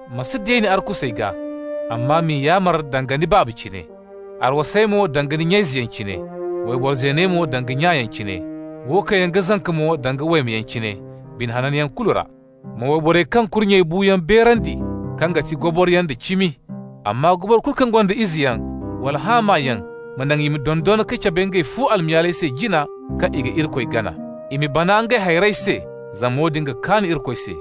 Ma si deeni arkusey gaa, amma m'i yaamar danga ni baaba cine. Arwasey mo danga ni nya-izeyaŋ cine, wayboro zeeney mo danga nyayaŋ cine, wo kaŋ yaŋ ga zanka mo danga waymeyaŋ cine, bine hananyaŋ kulu ra. Ma wayborey kaŋ kurnyey bu yaŋ beerandi kaŋ ga ti goboroyaŋ da cimi. Amma goboro kulu kaŋ gonda izeyaŋ wala haamayaŋ, ma naŋ i ma dondon ka cabe ngey fu almayaaley se jina kaŋ i ga Irikoy gana. I ma bana ngey hayrey se, zama woodin ga kaan Irikoy se.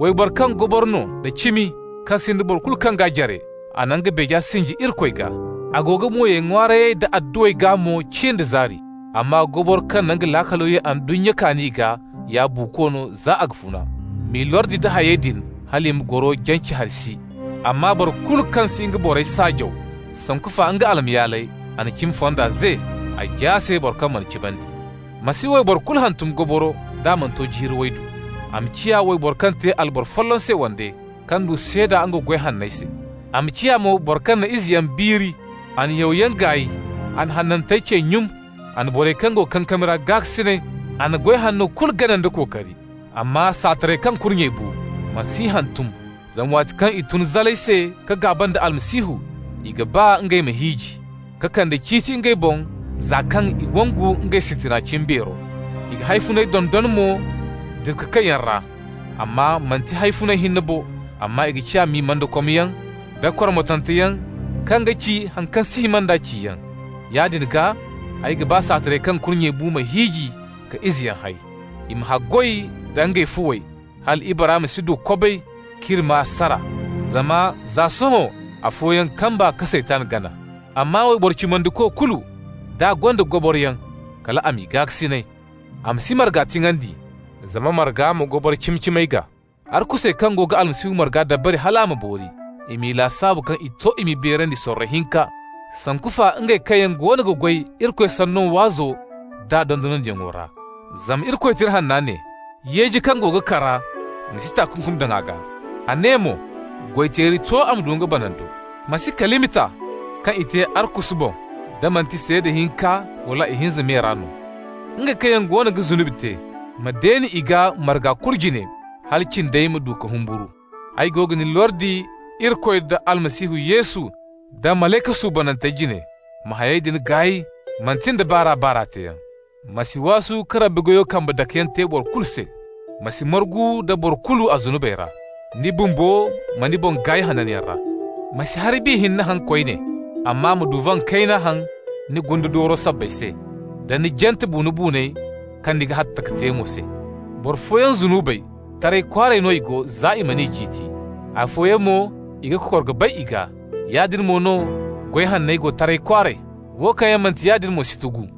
Wayboro kaŋ goboro no da cimi, kaŋ sinda boro kulu kaŋ g'a jare, a na nga beeja sinji Irikoy gaa. A go ga mo ye ŋwaarayey da adduwey gaa mo cin da zaari. Amma goboro kaŋ ga nga laakalo ye ndunnya kaani gaa ya buuko no za a ga funa. M'i lordi nda hayey din, hal i ma goro jance hari si. Amma boro kulu kaŋ si ga nga borey saajaw, sanku fa nga almayaaley, a na cimi fonda ze, a jaase boro kaŋ mana cimandi. Ma si wayboro kulu hantum goboro d'a mana to jiiri waydu. A ma ciya wayboro kaŋ te alboro folloŋ se wande, kaŋ du seeda nga goy hanney se. A ma ciya mo boro kaŋ na izeyaŋ biiri, a na yawyaŋ gaay, a na hanantey cey nyun, a na borey kaŋ go kankami ra gaakasinay, a na goy hanno kulu gana nda kookari. Amma saatarey kaŋ kurnyey bu, ma s'i hantum, zama waati kaŋ i tun zalay se ka gaaba nda Almasihu, i ga ba ngey ma hiiji, ka kande ciiti ngey boŋ za kaŋ i wangu ngey sintina cimbeero. I ga hawfunay dondon mo dira-ka-kayyaŋ ra. Amma manti hawfuna hinne bo, amma i ga ciya mimandakomyaŋ da kormotanteyaŋ kaŋ ga ci haŋ kaŋ si hima nda ciyaŋ. Yaadin gaa, ay ga ba saatarey kaŋ kurnyey bu ma hiiji ka izeyaŋ hay. I ma haggoy da ngey fuwey, hal ibara ma si du kobay k'iri maa sara. Zama za sohõ afooyaŋ kamba ka Saytan gana. Amma wayboro cimandiko kulu, d'a gonda goboroyaŋ, kal a m'i gaakasinay. A ma si marga tiŋandi, zama marga ma goboro cimi-cimey gaa. Arkusey kaŋ go ga Almasihu marga dabari hal a ma boori, i m'i lasaabu kaŋ i to i m'i beerandi sorro hinka, sanku fa ngey kaŋ yaŋ goono ga goy Irikoy Sanno waazo d'a dondonandiyaŋo ra. Zama Irikoy Tira Hanna ne: «Yeeji kaŋ go ga kara, ni ma si takunkum daŋ a gaa.» A ne mo: «Goy-teeri to a ma du nga banando.» Ma si kalima ta kaŋ i te arkusu boŋ da manti seeda hinka wala ihinza me ra no. Ngey kaŋ yaŋ goono ga zunubi te, ma deeni i gaa marga kulu jine, hala cindey ma du ka humburu. Ay go ga ni lordi Irikoy, da Almasihu Yesu, da malayka suubanantey jine: ma hayey din gaay manti nda baar'a-baar'a teeyaŋ. Ma si waasu ka Rabbi goyo kambe dakeyaŋ te boro kulu se. Ma si margu nda boro kulu a zunubey ra. Ni bumbo, ma ni boŋ gaay hananyaŋ ra. Ma si hari bi hinne haŋ koyne, amma ma duvan kayna haŋ ni gunde dooro sabbay se, da ni jante buuno-buuney kaŋ ni ga hatta ka te mo se. Boro fooyaŋ zunubey, taray kwaaray no i go, za i man'i ciiti. Afooyaŋ mo, i ga kokor ka bay i gaa. Yaadin mo no goy hanney go taray kwaaray. Wo kaŋ yaŋ manti yaadin mo si tugu.